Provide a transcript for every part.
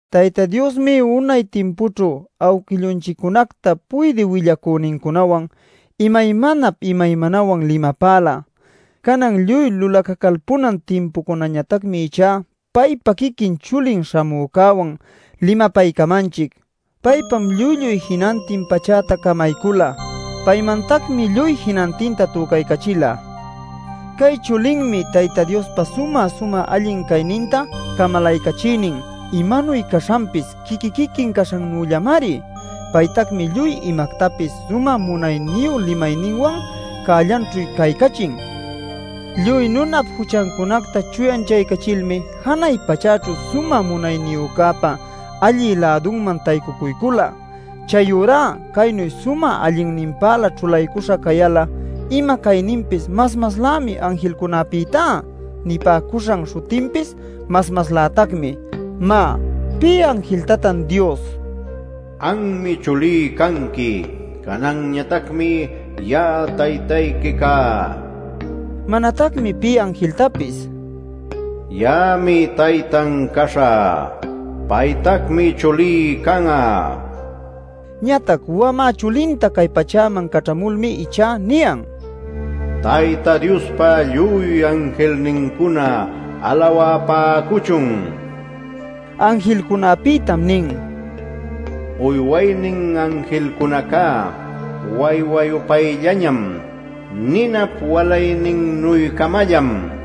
Tayta Diosmi unay timpućhu awquillunchiccunacta puydï willacünincunawan imaymanap imaymanawan limapäla. Canan lluy lulacacalpunan timpucunañatacmi ichá paypa quiquin chulin śhamücäwan limapaycamanchic. Paypam lluy-lluy jinantin pachäta camaycula. Paymantacmi lluy jinantinta tücaycachila. Cay chulinmi Tayta Diospa sumä-sumä allin cayninta camalaycachïnin; imanuy caśhanpis quiqui-quiquin caśhannüllamari. Paytacmi lluy imactapis sumä munayniyu limayninwan cällanćhu caycachin. Lluy nunap juchancunacta chuyanchaycachilmi janay pachäćhu Sumä Munayniyücäpa allï-lädunman taycucuycula. Chayurá caynu sumä allinninpälä ćhulaycuśha cayal'a ima cayninpis mas-maslämi anjilcunäpïtá. Nipäcuśhan śhutinpis mas-maslätacmi. Má ¿pï anjiltatan Dios: “Anmi chulí canqui; cananñatacmi ya'a taytayqui cá” nila? Manatacmi pï anjiltapis: “Ya'ami taytan caśhä. Paytacmi chulí can'a” nil nilachu. Ñatac wamä chulinta cay pachäman caćhamulmi ichá niyan: “Tayta Diospa lluy anjilnincuna alawapäcuchun” Anjilcunapïtam nin: “Uywaynin anjilcunaca waywa-yupayllañam, ninap walayninnuy-camallam” nil.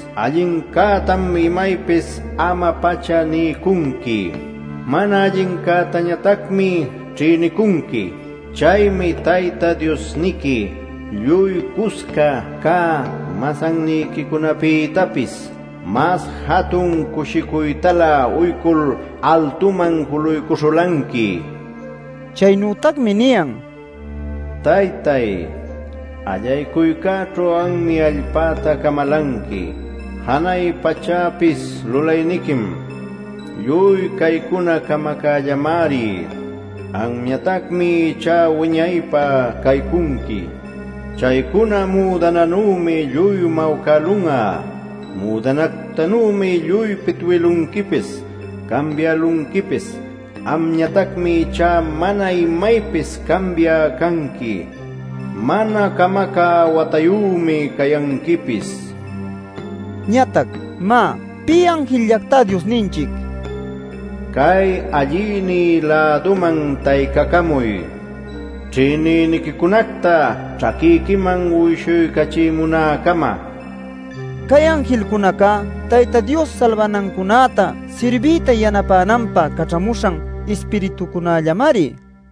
Allincätam imaypis ama-pacha niycunqui; mana allincätañatacmi ćhïnicunqui. Chaymi Tayta Diosniqui lluy cusca cä masanniquicunapïtapis mas jatun cushicuytalä uycul altuman juluycuśhulanqui” nil. Chaynütacmi niyan: “Taytay, allaycuycäćhu anmi allpäta camalanqui; janay pachäpis lulayniquim. Lluy caycuna camacällamari. Amñatacmi ichá wiñaypä caycunqui. Chaycuna müdananümi lluy mawcälun'a. Müdanactanümi lluy pitwïlunquipis, cambiälunquipis. Amñatacmi ichá mana imaypis cambiä canqui; mana camacä watayümi cayanquipis” nil. Ñatac, má ¿pï anjilllactá Diosninchic: “Cay allïnï-läduman taycacamuy ćhïnïniquicunacta ćhaquiquiman uyshuycachimunäcama” nil nilatan? Cay anjilcunacá Tayta Dios salbanancunäta sirbiyta yanapänanpä caćhamuśhan ispiritucunallamari.